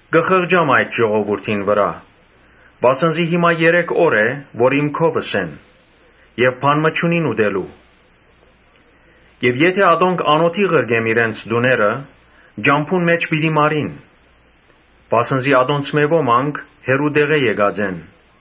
«Կը խղճամ այդ ժողովուրդին վրայ, վասն զի հիմա երեք օր է, որ իմ քովս են եւ բան մը չունին ուտելու։ Եթէ ատոնք անօթի ղրկեմ իրենց տուները, ճամբուն մէջ պիտի մարին, վասն զի ատոնցմէ ոմանք հեռու տեղէ եկած են»։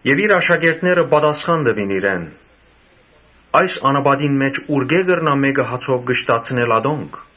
Իր աշակերտները պատասխան տուին իրեն. «Այս անապատին մէջ ուրկէ՞ կրնայ մէկը հացով կշտացնել ատոնք»։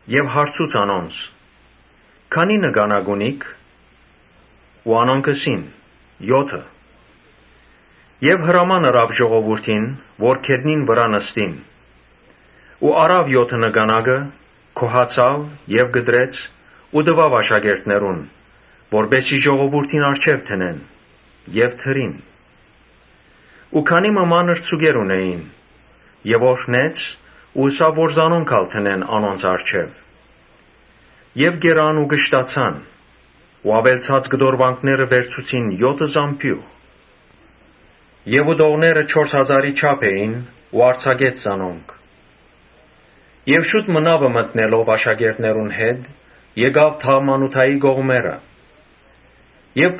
Յիսուս հարցուց անոնց. «Քանի՞ նկանակ ունիք»։ Անոնք ըսին. «Եօթը» Հրաման ըրաւ ժողովուրդին՝ որ գետնին վրայ նստին։ Առաւ եօթը նկանակը, գոհացաւ եւ կտրեց ու տուաւ աշակերտներուն, որպէս զի ժողովուրդին առջեւ դնեն եւ դրին։ Քանի մը մանր ձուկեր ալ ունէին։ Օրհնեց ու ըսաւ որ զանոնք ալ դնեն անոնց առջեւ։ Կերան ու կշտացան ու աւելցած կտորուանքը վերցուցին եօթը զամբիւղ։ Ուտողները չորս հազարի չափ էին ու արձակեց զանոնք։ Եւ շուտ մը նաւ մտնելով աշակերտներուն հետ՝ գնաց Դաղմանութայի կողմերը։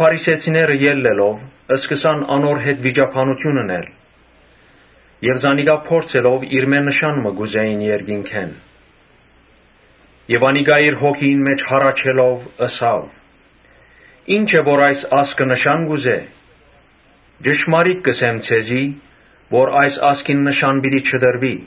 Փարիսեցիները ելլելով՝ սկսան անոր հետ վիճաբանութիւն ընել եւ զանիկա փորձելով՝ իրմէ նշան մը կ’ուզէին երկնքէն։ Անիկա իր հոգիին մէջ հառաչելով՝ ըսաւ. «Ինչո՞ւ այս ազգը նշան կ’ուզէ։ Ճշմարիտ կ’ըսեմ ձեզի որ այս ազգին նշան պիտի չտրուի»։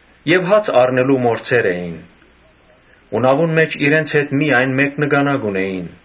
Հաց առնել մոռցեր էին, բայց նաւուն մէջ իրենց հետ միայն մէկ նկանակ ունէին։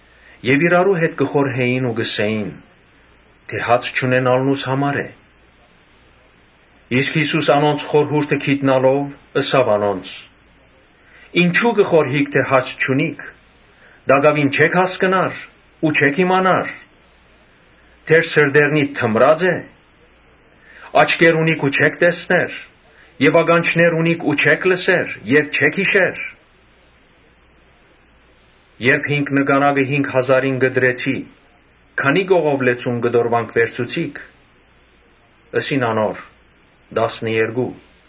Անոնք իրարու հետ կը խորհէին ու կ’ըսէին. «Հաց չունենալնուս համար է»։ Յիսուս անոնց խորհուրդը իմանալով՝ ըսաւ անոնց. «Ինչո՞ւ կը խորհիք թէ հաց չունիք. տակաւին չէ՞ք հասկնար ու չէ՞ք իմանար. դեռ սրտերնիդ թմրա՞ծ է։ Աչքեր ունիք ու չէ՞ք տեսներ եւ ականջներ ունիք ու չէ՞ք լսեր։ Չէ՞ք յիշեր, երբ հինգ նկանակը հինգ հազարին կտրեցի։ Քանի՞ կողով լեցուն կտորուանք վերցուցիք»։ Ըսին անոր. «Տասներկու»։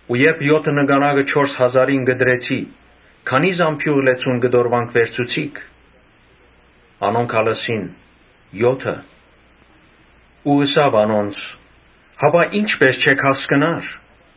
«Ու երբ եօթը նկանակը չորս հազարին կտրեցի, քանի՞ զամբիւղ լեցուն կտորուանք վերցուցիք»։ Անոնք ալ ըսին. «Եօթը»։ Ու ըսաւ անոնց. «Հապա ի՞նչպէս չէք հասկնար»։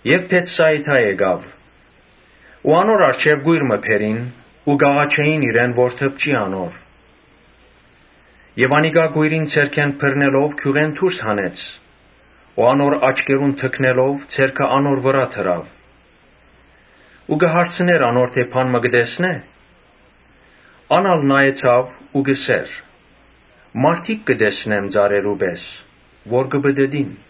Երբ Բեթսայիդա գնաց, անոր առջեւ կոյր մը բերին ու կ’աղաչէին իրեն որ դպչի անոր։ Անիկա կոյրին ձեռքէն բռնելով գիւղէն դուրս հանեց ու անոր աչքերուն թքնելով՝ ձեռքը անոր վրայ դրաւ ու հարցուց անոր թէ՝ բան մը կը տեսնէ՞։ Ան ալ նայեցաւ ու ըսաւ. «Մարդիկ կը տեսնեմ ծառերու պէս որ կը պտըտին»։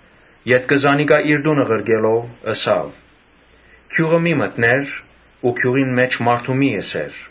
Ետքը զանիկա իր տունը ղրկելով՝ ըսաւ. «Գիւղը մի՛ մտներ ու գիւղին մէջ մարդու մի՛ ըսեր»։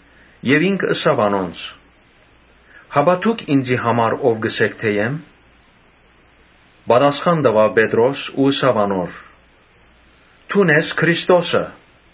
Եւ ինք ըսաւ անոնց. «Հապա դո՞ւք ինծի համար ո՞վ կ’ըսէք թէ եմ»։ Պատասխան տուաւ Պետրոս ու ըսաւ անոր. «Դուն ես Քրիստոսը»։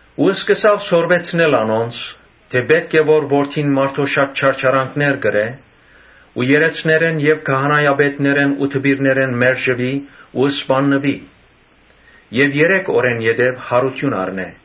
Ապա սկսաւ սորվեցնել անոնց, թէ «Պէտք է որ Որդին մարդոյ շատ չարչարանքներ կրէ ու երէցներէն եւ քահանայապետներէն ու դպիրներէն մերժուի ու սպաննուի եւ երեք օրէն յետոյ յարութիւն առնէ»։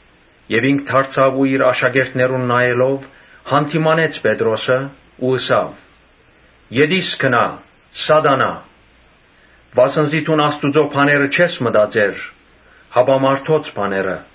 Ինք դարձաւ ու իր աշակերտներուն նայելով՝ յանդիմանեց Պետրոսը ու ըսաւ. «Ետի՛ս գնա, Սատանայ, վասն զի դուն Աստուծոյ բաները չես մտածեր, հապա մարդոց բաները»։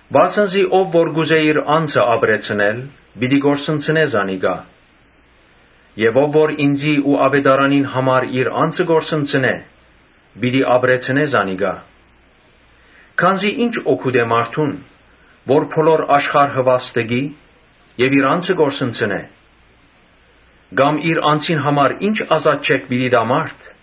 Վասն զի ով որ կ’ուզէ իր անձը ապրեցնել, պիտի կորսնցնէ զանիկա եւ ով որ ինծի ու աւետարանին համար իր անձը կը կորսնցնէ, պիտի ապրեցնէ զանիկա։ Քանզի ի՞նչ օգուտ է մարդուն՝ որ բոլոր աշխարհը վաստկի եւ իր անձը կորսնցնէ. Կամ իր անձին համար ի՞նչ ազատչէք պիտի տայ մարդ։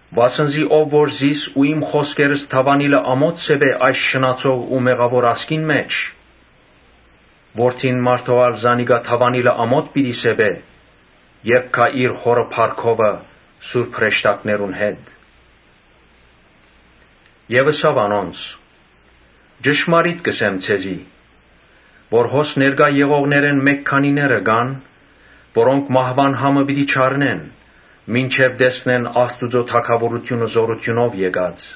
Վասն զի ով որ զիս ու իմ խօսքերս դաւանիլը ամօթ սեպէ այս շնացող ու մեղաւոր ազգին մէջ, Որդին մարդոյ ալ զանիկա դաւանիլը ամօթ պիտի սեպէ՝ երբ գայ իր Հօրը փառքովը սուրբ հրեշտակներուն հետ»։ Եւ ըսաւ անոնց. «Ճշմարիտ կ’ըսեմ ձեզի, որ հոս ներկայ եղողներէն մէկ քանիները կան՝ որոնք մահուան համը պիտի չառնեն, մինչեւ տեսնեն Աստուծոյ թագաւորութիւնը զօրութիւնով եկած»։